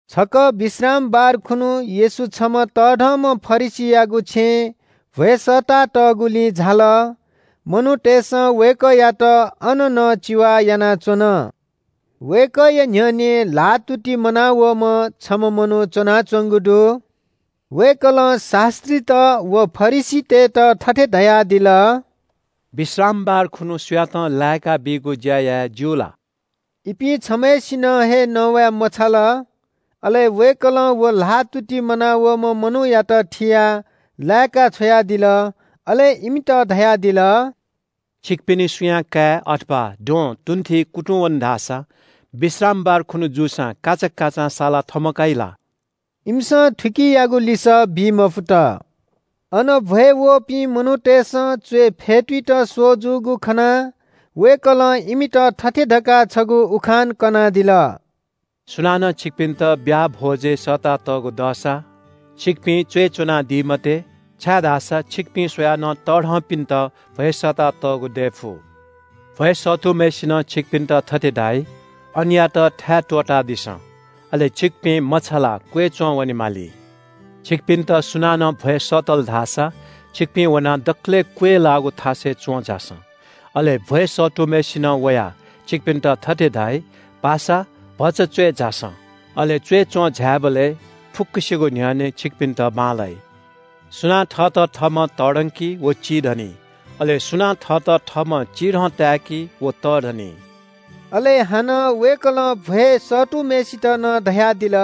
छकः विश्रामबार खुन्‍हु येशू छम्‍ह तःधंम्‍ह फरिसीयागु छेँय् भ्‍वय् सःतातःगुलिं झाल। मनूतय्‌सं वय्‌कःयात अन नं चिवा यानाच्‍वन। वय्‌कःया न्‍ह्यःने ल्‍हाःतुति मनावःम्‍ह छम्‍ह मनू च्‍वनाच्‍वंगु दु। वय्‌कलं शास्‍त्रीत व फरिसीतय्‌त थथे धयादिल – “विश्रामबार खुन्‍हु सुयातं लाय्‌काबीगु ज्‍या याये ज्‍यू ला?” इपिं छम्‍हय्‌सिनं हे नवाय् मछाल। अले वय्‌कलं व ल्‍हाःतुति मनावःम्‍ह मनूयात थियाः लाय्‌का छ्वयादिल। अले इमित धयादिल – “छिकपिनि सुयां काय् अथवा द्वहं तुंथिइ कुतुंवन धाःसा विश्रामबार खुन्‍हु जूसां काचाकाचां सालाः थमकाइ ला?” इमिसं थुकियागु लिसः बी मफुत। अन भ्‍वय् वःपिं मनूतय्‌सं च्‍वय् फ्‍यतुइत स्‍वः जूगु खनाः वय्‌कलं इमित थथे धकाः छगू उखान कनादिल – “सुनानं छिकपिन्‍त ब्‍याहा भ्‍वजय् सःतातःगु दःसा छिकपिं च्‍वय् च्‍वनादी मते, छाय्‌धाःसा छिकपिं स्‍वयाः नं तःधंपिन्‍त भ्‍वय् सःतातःगु दये फु। भ्‍वय् सःतूम्‍हय्‌सिनं छिकपिन्‍त थथे धाइ – ‘अनयात थाय् त्‍वःतादिसँ।’ अले छिकपिं मछालाः क्‍वय् च्‍वंवने माली। “छिकपिन्‍त सुनानं भ्‍वय् सःतल धाःसा छिकपिं वनाः दकलय् क्‍वय् लाःगु थासय् च्‍वं झासँ। अले भ्‍वय् सःतूम्‍हय्‌सिनं वयाः छिकपिन्‍त थथे धाइ – ‘पासा, भचा च्‍वय् झासँ।’ अले च्‍वय् च्‍वं झायेबलय् फुक्‍कसिगु न्‍ह्यःने छिकपिन्‍त बांलाइ। सुनां थःत थःम्‍हं तःधंकी व चिधनी। अले सुनां थःत थःम्‍हं चिधं ताय्‌की व तःधनी।” अले हानं वय्‌कलं भ्‍वय् सःतूम्‍हय्‌सित नं धयादिल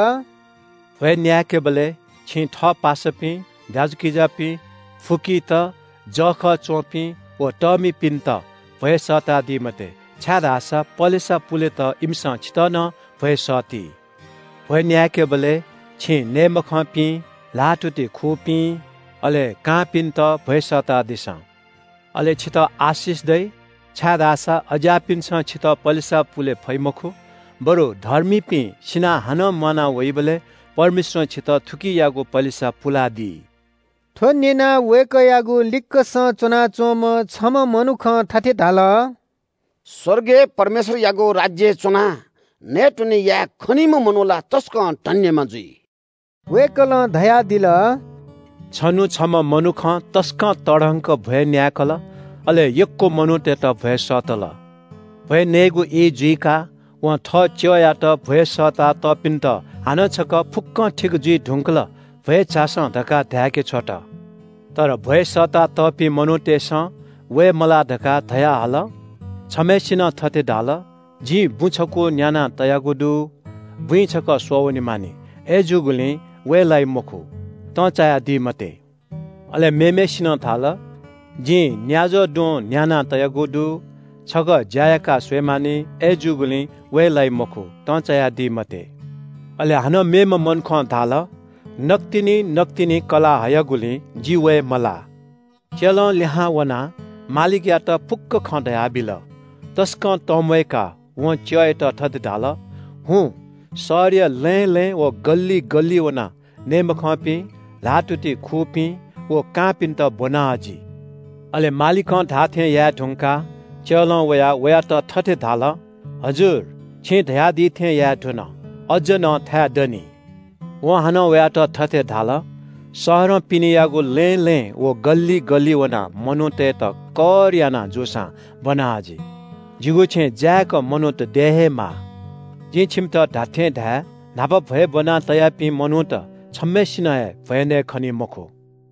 – “भ्‍वय् न्‍याय्‌केबलय् छिं थः पासापिं, दाजुकिजापिं, फुकीत, जःखः च्‍वंपिं व तःमिपिन्‍त भ्‍वय् सःतादी मते, छाय्‌धाःसा पलेसा पुलेत इमिसं छितः नं भ्‍वय् सःती। भ्‍वय् न्‍याय्‌केबलय् छिं नये मखंपिं, ल्‍हाःतुति खूपिं, अले कांपिन्‍त भ्‍वय् सःतादिसँ। अले छितः आशिष दइ, छाय्‌धाःसा अज्‍याःपिन्‍सं छितः पलेसा पुले फइ मखु। बरु धर्मीपिं सिनाः हानं म्‍वाना वइबलय् परमेश्‍वरं छितः थुकियागु पलेसा पुलादी।” थ्‍व न्‍यनाः वय्‌कःयागु लिक्‍कसं च्‍वनाच्‍वंम्‍ह छम्‍ह मनुखं थथे धाल – “स्‍वर्गय् परमेश्‍वरयागु राज्‍यय् च्‍वनाः नयेत्‍वने याये खनीम्‍ह मनू ला तसकं धन्‍यम्‍ह जुइ।” वय्‌कलं धयादिल – “छन्‍हु छम्‍ह मनुखं तसकं तःधंक भ्‍वय् न्‍याय्‌कल, अले यक्‍व मनूतय्‌त भ्‍वय् सःतल। भ्‍वय् नयेगु ई जुइकाः वं थः च्‍यःयात भ्‍वय् सःता तःपिन्‍त हानं छकः ‘फुक्‍कं ठीक जुइ धुंकल, भ्‍वय् झासँ’ धकाः धाय्‌के छ्वत। तर भ्‍वय् सःतातःपिं मनूतय्‌सं वये मलाः धकाः धयाहल। छम्‍हय्‌सिनं थथे धाल – ‘जिं बुँ छकू न्‍याना तयागु दु। बुँइ छकः स्‍वः वनेमानि। अय्‌जूगुलिं वये लाइ मखु, तंचायादी मते।’ अले मेम्‍हय्‌सिनं धाल – ‘जिं न्‍याज्‍वः द्वहं न्‍याना तयागु दु, छकः ज्‍या याकाः स्‍वये मानि। अय्‌जूगुलिं वये लाइ मखु, तंचायादी मते।’ अले हानं मेम्‍ह मनुखं धाल – ‘नकतिनि नकतिनि कलाः हयागुलिं जि वये मलाः।’ “च्‍यलं लिहां वनाः मालिकयात फुक्‍क खँ धयाबिल। तसकं तंम्‍वय्‌काः वं च्‍यःयात थथे धाल – ‘हुँ, शहरया लँय् लँय् व गल्‍लिइ गल्‍लिइ वनाः नये मखंपिं, ल्‍हाःतुति खूपिं व कांपिन्‍त ब्‍वना हजि।’ अले मालिकं धाःथें याये धुंकाः च्‍यलं वयाः वयात थथे धाल – ‘हजुर, छिं धयादी थें याये धुन, अज्‍ज नं थाय् दनि।’ वं हानं वयात थथे धाल – ‘शहरं पिनेयागु लँय् लँय् व गल्‍लिइ गल्‍लिइ वनाः मनूतय्‌त कर याना जूसां ब्‍वना हजि। जिगु छेँ जाय्‌क मनूत दये हे माः। जिं छिमित धात्‍थें धाये – न्‍हापा भ्‍वय् ब्‍वना तयापिं मनूत छम्‍हय्‌सिनं हे भ्‍वय् नयेखनी मखु।’”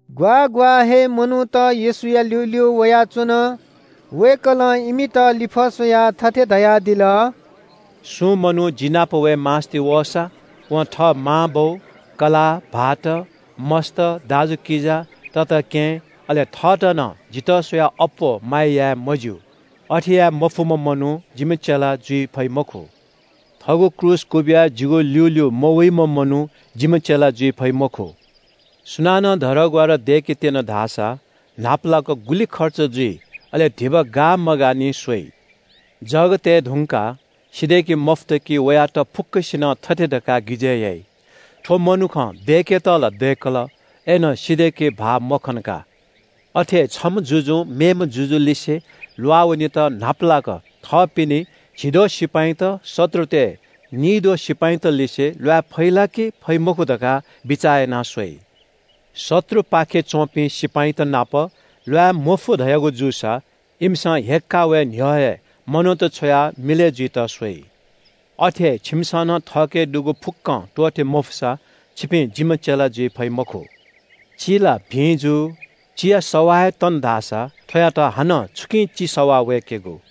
ग्‍वाः ग्‍वाः हे मनूत येशूया ल्‍यूल्‍यू वयाच्‍वन। वय्‌कलं इमित लिफः स्‍वयाः थथे धयादिल – “सुं मनू जि नाप वये मास्‍ति वःसा वं थः मांबौ, कलाः, भाःत, मस्‍त, दाजुकिजा, तताकेहेँ, अले थःत नं जितः स्‍वयाः अप्‍वः माया याये मज्‍यू। अथे याये मफुम्‍ह मनू जिम्‍ह चेला जुइ फइ मखु। थःगु क्रूस क्‍वबिया जिगु ल्‍यूल्‍यू मवइम्‍ह मनू जिम्‍ह चेला जुइ फइ मखु।” “सुनानं धरहरा दय्‌केत्‍यन धाःसा न्‍हापालाक गुलि खर्च जुइ, अले धिबा गाः मगाः निं स्‍वइ। जग तये धुंकाः सिधय्‌के मफुत कि वयात फुक्‍कसिनं थथे धकाः गिजय् याइ – ‘थ्‍व मनुखं दय्‌केत ला दय्‌कल, अय्‌नं सिधय्‌के भाः मखन का।’ “अथे हे छम्‍ह जुजुं मेम्‍ह जुजुलिसे ल्‍वाःवनेत न्‍हापालाक थःपिनि झिद्वः सिपाइँत शत्रुतय् निइद्वः सिपाइँतलिसे ल्‍वाये फइ ला कि फइ मखु धकाः बिचाः याना स्‍वइ। शत्रुपाखे च्‍वंपिं सिपाइँत नाप ल्‍वाये मफु धयागु जूसा, इमिसं हय्‌काः वये न्‍ह्यः हे मनूत छ्वयाः मिलय् जुइत स्‍वइ। अथे हे छिमिसं नं थःके दुगु फुक्‍कं त्‍वःते मफुसा छिपिं जिम्‍ह चेला जुइ फइ मखु। “चि ला भिं जू। चिया सवाः हे तन धाःसा थ्‍वयात हानं छुकिं चि सवाः वय्‌केगु?